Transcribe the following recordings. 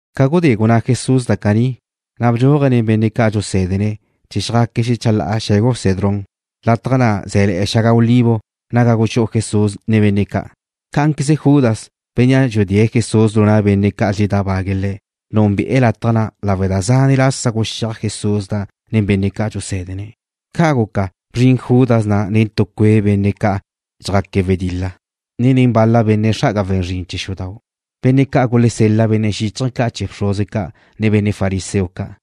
Ca gudé gunná Jesús da caní, na' bdxúaje̱' nen benne' ca' dxusé̱dene̱' chee̱ chjaque̱' xecha la'a xe̱gu Cedrón. Lataj na' zé̱le̱'e̱ xaga olivo naga guxú'u Jesús nen benne' ca'. Cá'anqueze Judas, bénnea' dxudée̱' Jesús lu na' benne' ca' dxeledábague̱' Le̱', núnbe'e̱ lataj na' lawe' da zane' lasa guxíaj Jesús na' nen benne' ca' dxusé̱dene̱'. Ca' guca, bzrin Judas na' nen tu cue' benne' ca' dxjaque̱' wedil-la, ne nen bal-la benne' xra'aga we̱n zrin chee̱ xudau', benne' ca' gulesel-la benne' xíchaje̱ ca' chee̱ bxruze ca', ne benne' fariseo ca'.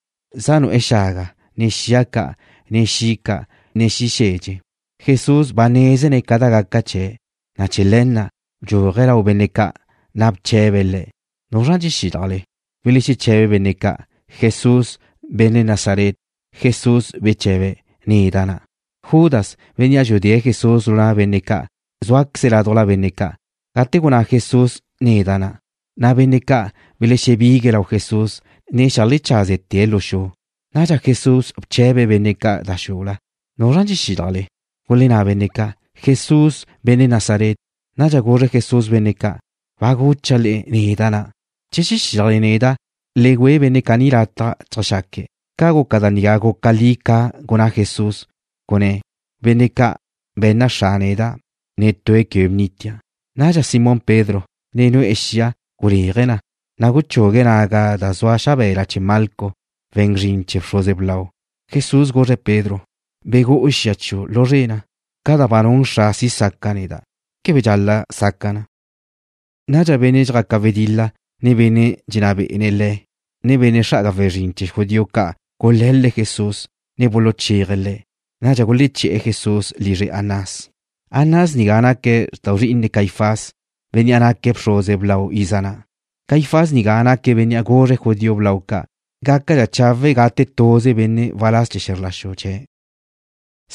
Zaj nu'e̱ xaga, ne xia ca', ne xi' ca', ne xi' xedxe. Jesús ba nézene̱' ca da gaca chee̱', na' chee̱ le̱ na' bdxúaje̱' lau benne' ca', na' bche̱be̱' le̱': ―¿Nuzra dxexílajle? Belexeche̱be benne' ca': ―Jesús, benne' Nazaret. Jesús beche̱be̱': ―Neda' na'. Judas, bénnea' dxudée̱' Jesús lu na' benne' ca' zúaqueze̱' ládujla benne' ca'. Gate gunná Jesús: Neda' na', na' benne' ca' belexebigue̱' lau Jesús, ne xeajlechazte̱' lu xu. Nadxa Jesús bche̱be̱' benne' ca' da xula: ―¿Nuzra dxexílajle? Gulenná benne' ca': ―Jesús, benne' Nazaret. Nadxa guzre Jesús benne' ca': ―Ba gucha' le'e neda' na'. Che dxexílajle neda', le güe benne' caní lataj cheajxaque̱'. Ca guca da nigá guca li ca gunná Jesús, gunné̱': “Benne' ca' be̱nna Xra' neda', netue̱' quebe bnitia'.” Nadxa Simón Pedro, ne nu'e̱ xia, guléaje̱' na, na' guchugue̱' naga da zua xabe̱la chee̱ Malco, we̱n zrin chee̱ bxruze blau. Jesús guzre̱' Pedro: ―Begú'u xia chiu' lu zre na. Ca da ba nun Xra' si' saca' neda', ¿quebe dxal-la' saca' na? Nadxa benne' dxjaca wedil-la, ne benne' dxenná be'ene̱' le̱', ne benne' xra'aga we̱n zrin chee̱ judío ca' gule̱l-le̱' Jesús, ne buluchéaje̱' Le̱'. Nadxa guleché̱'e̱ Jesús lizre Anás. Anás nigá naque̱' xrtau zri'ine Caifás, bénnea' naque̱' bxruze blau iza na'. Caifás nigá naque̱' bénnea' guzre̱' judío blau ca' gácadxa chawe' gate tuze benne' waláz chee̱ xe̱zr la xu chee̱'.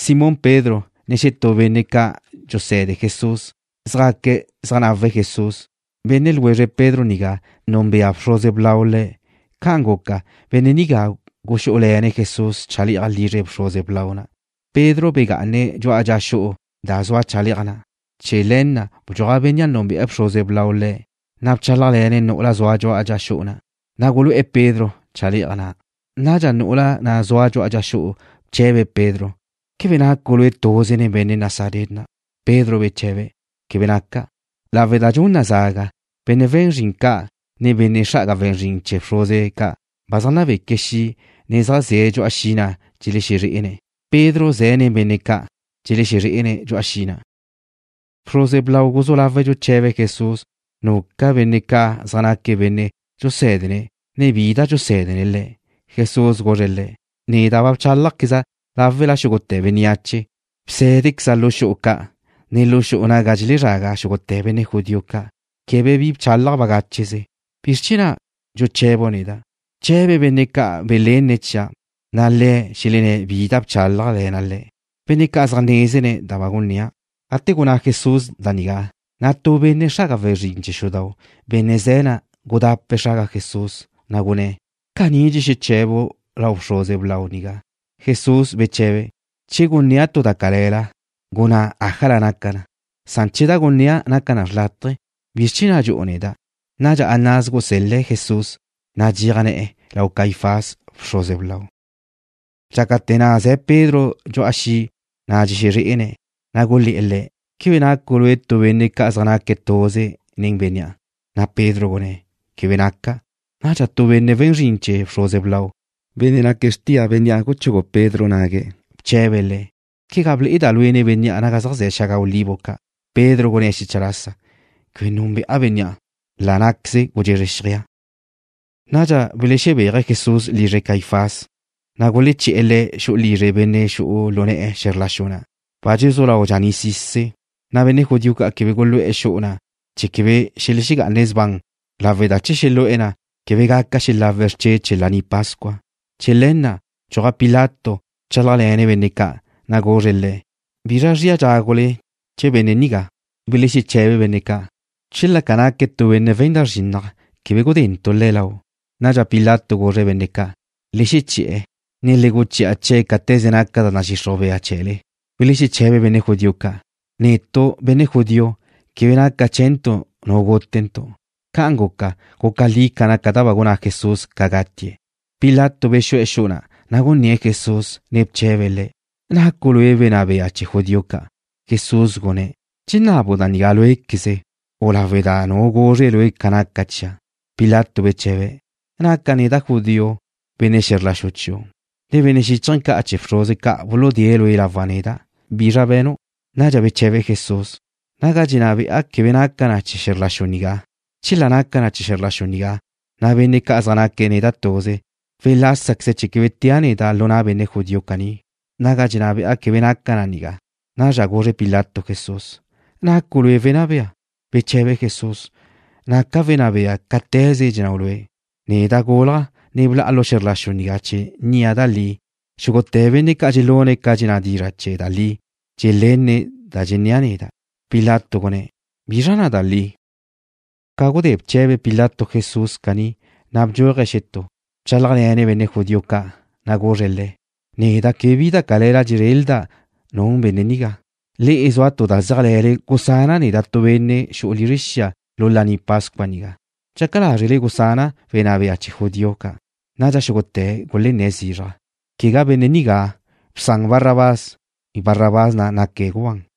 Simón Pedro, ne xetú benne' ca' dxuse̱de Jesús zjaque̱' zeajnawe̱' Jesús. Benne' ljwezre Pedro nigá núnbea bxruze blau le̱'. Ca'an guca, benne' nigá guxú'ule̱ne̱' Jesús chale'aj lizre bxruze blau na'. Pedro begá'ane̱' dxu'a dxa xu'u da zua chale'aj na'. Chee̱ le̱ na' bdxuaj bénnea' núnbea bxruze blau le̱', na' bchálajle̱ne̱' nu'ula zua dxu'a dxa xu'u na', na' gulu'e̱ Pedro chale'aj na'. Nadxa nu'ula na' zua dxu'a dxa xu'u bche̱be̱' Pedro: ―¿Quebe nacu' lue' tuze nen benne' Nazaret na'? Pedro beche̱be̱': ―Quebe naca'. Lawe' da dxun na zaga, benne' we̱n zrin ca', ne benne' xra'aga we̱n zrin chee̱ bxruze ca' ba zaj nabeque̱' xi', ne zaj ze̱' dxu'a xi' na' dxelexezré'ene̱'. Pedro ze̱' nen benne' ca', dxexezré'ene̱' dxu'a xi' na'. Bxruze blau guzú lawe̱' dxuche̱be̱' Jesús nuca benne' ca' zaj naque̱' benne' dxusé̱dene̱', ne bi da dxusé̱dene̱' le̱'. Jesús guzre̱' le̱': ―Neda' ba bchálajqueza' láwela xúgute̱ bénneache. Bsé̱dequeza' lu xu'u ca', ne lu xu'u naga dxelezraga xúgute̱ benne' judío ca'. Quebe bi bchálaja' bagácheze. ¿Bizr chee̱ na' dxuche̱bu' neda'? Bche̱be benne' ca' ba belenne̱' chia', na' le̱' xelenné̱' bi da bchálajle̱na' le̱'. Benne' ca' zaj nézene̱' da ba gunnéa'. Gate gunná Jesús da nigá, na' tu benne' xra'aga we̱n zrin chee̱ xudau', benne' ze̱' na', gudape̱' xraga Jesús, na' gunné̱': ―¿Caní dxexeche̱bu' lau bxruze blau nigá? Jesús beche̱be̱': ―Che gunnéa' tu da cale̱la, gunná ájala naca na. Che da gunnéa' naca na xrlátaje, ¿bizr chee̱ na' dxu'u neda'? Nadxa Anás gusél-le̱' Jesús, zaj nadxéaj ne̱'e̱, lau Caifás, bxruze blau. Dxácate̱ na' ze̱ Pedro dxu'a xi' na' dxexezré'ene̱', na' gulé̱'e̱ le̱': ―¿Quebe nacu' lue' tu benne' ca' zaj naque̱' tuze nen bénnea'? Na' Pedro gunné̱': ―Quebe naca'. Nadxa tu benne' we̱n zrin chee̱ bxruze blau, benne' naque̱' xrtia bénnea' guchugu Pedro nague̱', bche̱be̱' le̱': ―¿Quegá ble'eda' lue' nen bénnea' naga zaj ze̱ xaga olivo ca'? Pedro gunné̱' xecha lasa: ―Quebe núnbe'a bénnea'. La' ná'queze gudxezre xjeaj. Nadxa belexebéaje̱' Jesús lizre Caifás, na' guleché̱'e̱ Le̱' xu'u lizre benne' xu'u lu ne̱'e̱ xe̱zr la xu na' waláz chee̱ Roma. Ba dxezú lau dxaní'sise̱', na' benne' judío ca' quebe gulu'e̱ xu'u na' chee̱ quebe xelexegá'ane̱' sban, lawe' da che xelu'e̱ na', quebe gaca xelawe̱' xrche' chee̱ Laní Pascua. Chee̱ le̱ na' bdxuaj Pilato bchálajle̱ne̱' benne' ca', na' guzre̱' le̱': ―¿Bizra da zria dxágule benne' nigá? Belexeche̱be benne' ca': ―Chela ca naque̱' tu benne' we̱n da zrinnaj, quebe gudentu' le̱' lau'. Nadxa Pilato guzre̱' benne' ca': ―Le xeché̱'e̱, ne le guchi'a chee̱' cáte̱ze naca da nadxixruj bea chee̱le. Belexeche̱be benne' judío ca': ―Netu', benne' judío, quebe naca chee̱ntu' nu gútentu'. Ca'an guca, guca li ca naca da ba gunná Jesús ca gatie̱'. Pilato bexu'e̱ xu'u na', na' gunné̱' Jesús, ne bche̱be̱' Le̱': ―¿Nacu' Lue' Wenná Bea chee̱ judío ca'? Jesús gunné̱': ―¿Dxenabu' da nigá lue'zqueze, u lawe' da nu guzre lue' ca naca chia'? Pilato beche̱be̱': ―¿Naca' neda' judío? Benne' xe̱zr la xu chiu', ne benne' xíchaje̱ ca' chee̱ bxruze ca' buludée̱' lue' lawa' neda'. ¿Bizra be̱nu'? Nadxa beche̱be Jesús: ―Naga dxenná be'a quebe naca na chee̱ xe̱zr la xu nigá. Chela naca na chee̱ xe̱zr la xu nigá, na' benne' ca' zaj naque̱' neda' tuze welásaqueze̱' chee̱ quebe tea' neda' lu na' benne' judío caní. Naga dxenná be'a quebe naca na nigá. Nadxa guzre Pilato Jesús: ―¿Nacu' Lue' wenná bea? Beche̱be Jesús: ―Naca' wenná bea, cáte̱ze dxennáu' lue'. Neda' gúlaja', ne bla'a lu xe̱zr la xu nigá chee̱ nnia' da li. Xúgute̱ benne' ca' dxelune̱' ca dxenná dizra' chee̱ da li dxelenne̱' da dxennéa' neda'. Pilato gunné̱': ―¿Bizra na' da li? Ca gudé bche̱be Pilato Jesús caní, na' bdxúaje̱' xetú. Bchálajle̱ne̱' benne' judío ca', na' guzre̱' le̱': ―Neda' quebe bi da cale̱la dxezrelda' nun benne' nigá. Le'e zua tu da zéajle̱le. Gusana' neda' tu benne' xu'u lizre xia lu Laní Pascua nigá. ¿Dxaca lázrele gusana' wenná bea chee̱ judío ca'? Nadxa xúgute̱' gulenné̱' zizraj: ―¡Quegá benne' nigá! ¡Bsan Barrabás! Barrabás na' naque̱' gubán.